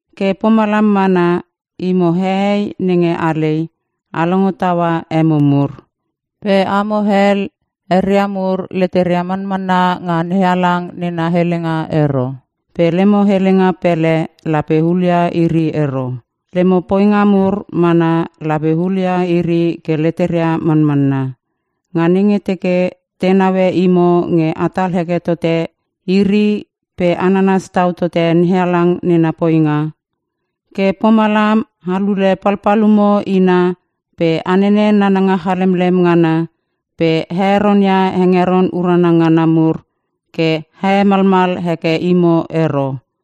Ke pomalam mana, imo hehei nenge alei a longo taua emo mur. Pe amo hel, eria mur leteria manmanna nga NeHalang nena helenga ero. Pe lemo helenga pele lape hulia iri ero, lemo poinga mur mana lape hulia iri ke leteria manmanna. Nga nenge teke te naue imo nge atal heke totote iri pe a nanas tau tote NeHalang nena poinga. Ke pomalam a lule palpalumo ina pe a nene nananga chalemlem ngana pe a heronia hengeron urana ngana mur ke a hemalmal heke imo ero.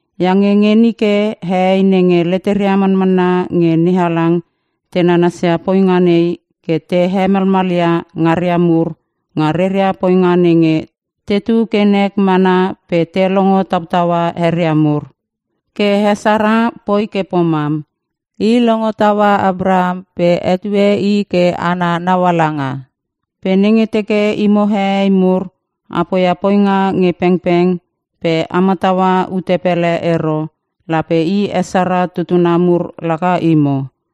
Iange nge nike hehei nenge leteria manmanna nge NeHalang te nanasia poinga nei, ke te hemalmalia ngaria mur nga reria poinga nenge tetu ke nek mana pe te longo tautaua eria mur. Ke he Sara poi ke pomam. I longo taua Apraham pe hetue i ke ana naualanga. Pe nenge teke imo hehei mur a poia poinga nge pengpeng pe a mataua ute pele ero lape he Sara tutuna mur laka imo.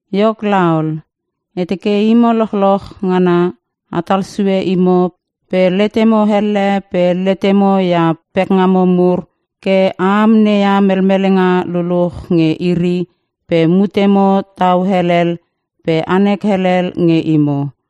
Iok laol, e teke imo lochloch ngana atal sue imo pe letemo elle pe letemo ia pekngamo mur ke a amneia melmelenga luluch nge iri pe mutemo tau helel pe anek helel nge imo.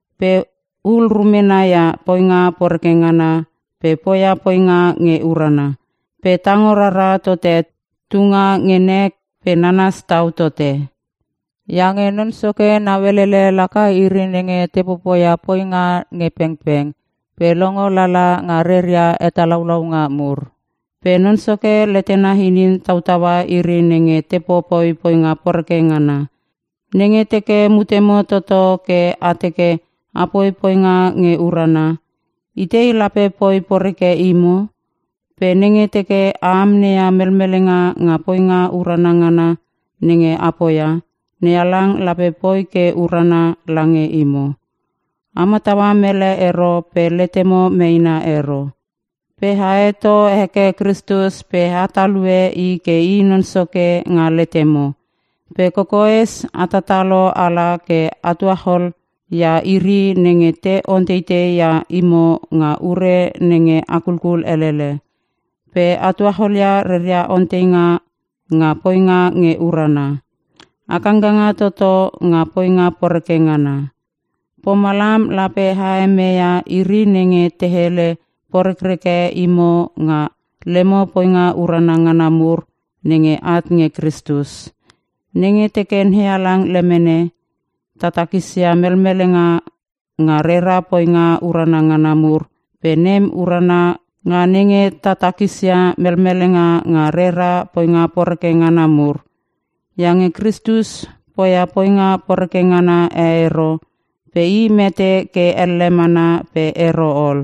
Pe hul rumena ia poinga poreke ngana pe poia poinga nge urana; pe tango rara tote tunga nge nek pe nanas tau tote. Iange Non Soke nauelele laka iri nenge te popoia poinga nge pengpeng pe longo lala nga reria hetalaulaunga mur. Pe Non Soke letena inin tautaua iri nenge te popoi poinga poreke ngana.” Nenge teke mutemo toto ke a teke a poia poinga nge urana, itei lape poi poreke imo? Pe nenge teke a amneia melmelenga nga poinga urana ngana nenge a poia, NeHalang lape poi ke urana lange imo. “A mataua mele ero pe letemo meena ero.” Pe a heto heke Kristus pe a talue i ke i Non Soke nga letemo. Pe kokoes a tatalo ala ke a tuachol ia iri nenge te onteitei ia imo nga ure nenge a kulkul elele, pe a tuacholia reria onteinga nga poinga nge urana. A kangkanga toto nga poinga poreke ngana, pomalam lape a hemeia iri nenge te hele porekreke imo nga lemo poinga urana ngana mur nenge at nge Kristus. Nenge teke NeHalang lemene, ta takisia melmelenga nga rera poinga urana ngana mur, pe nem urana nga nenge ta takisia melmelenga nga rera poinga poreke ngana mur. Iange Kristus poia poinga poreke ngana e ero pe I mete ke elle mana pe ero ol.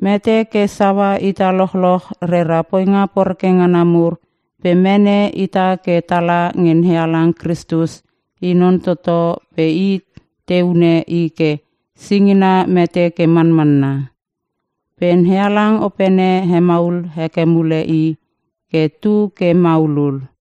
Mete ke saua ita lochloch rera poinga poreke ngana mur pe mene ita ke tala nge NeHalang. Kristus i non toto pe te hune i ke singina mete ke manmanna. Pe NeHalang Opene hemaul heke mule i ke tu ke maulul.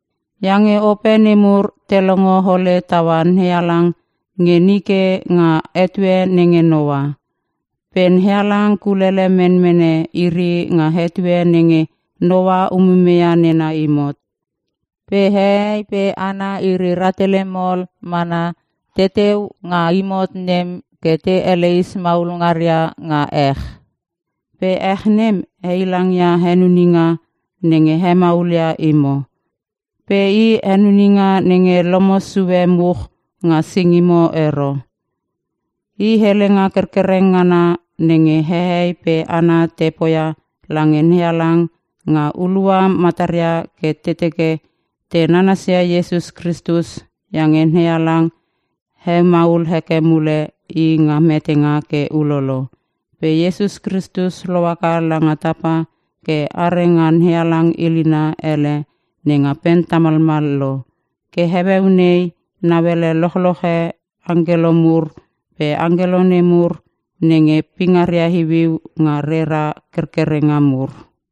iange ope nemur te longo ole taua NeHalang nge nike nga etue nenge Noa. Pe NeHalang kulele menmene iri nga etue nenge Noa umumeia nena imot. Pe hehei pe hana iri rahtele mol mana teteu nga imot nem ke te eleis maul ngaria nga ech. Pe ech nem heilangia henuninga nenge hemaulia imo, pe i henuninga nenge lomo sue much nga singimo ero. I helenga kerkereng ngana nenge hehei pe hana te poia lange NeHalang nga hulua mataria ke te teke te nanasia Iesus Kristus iange NeHalang hemaul heke mule i nga metenga ke ulolo. Pe Iesus Kristus lohaka langa tapa ke are nga NeHalang ilina ele nenga pen tamalmal lo. Ke heueu nei nauele lochloche angkelo mur pe angkelo nemur nenge pingaria iuiu nga reria kerkerenga mur.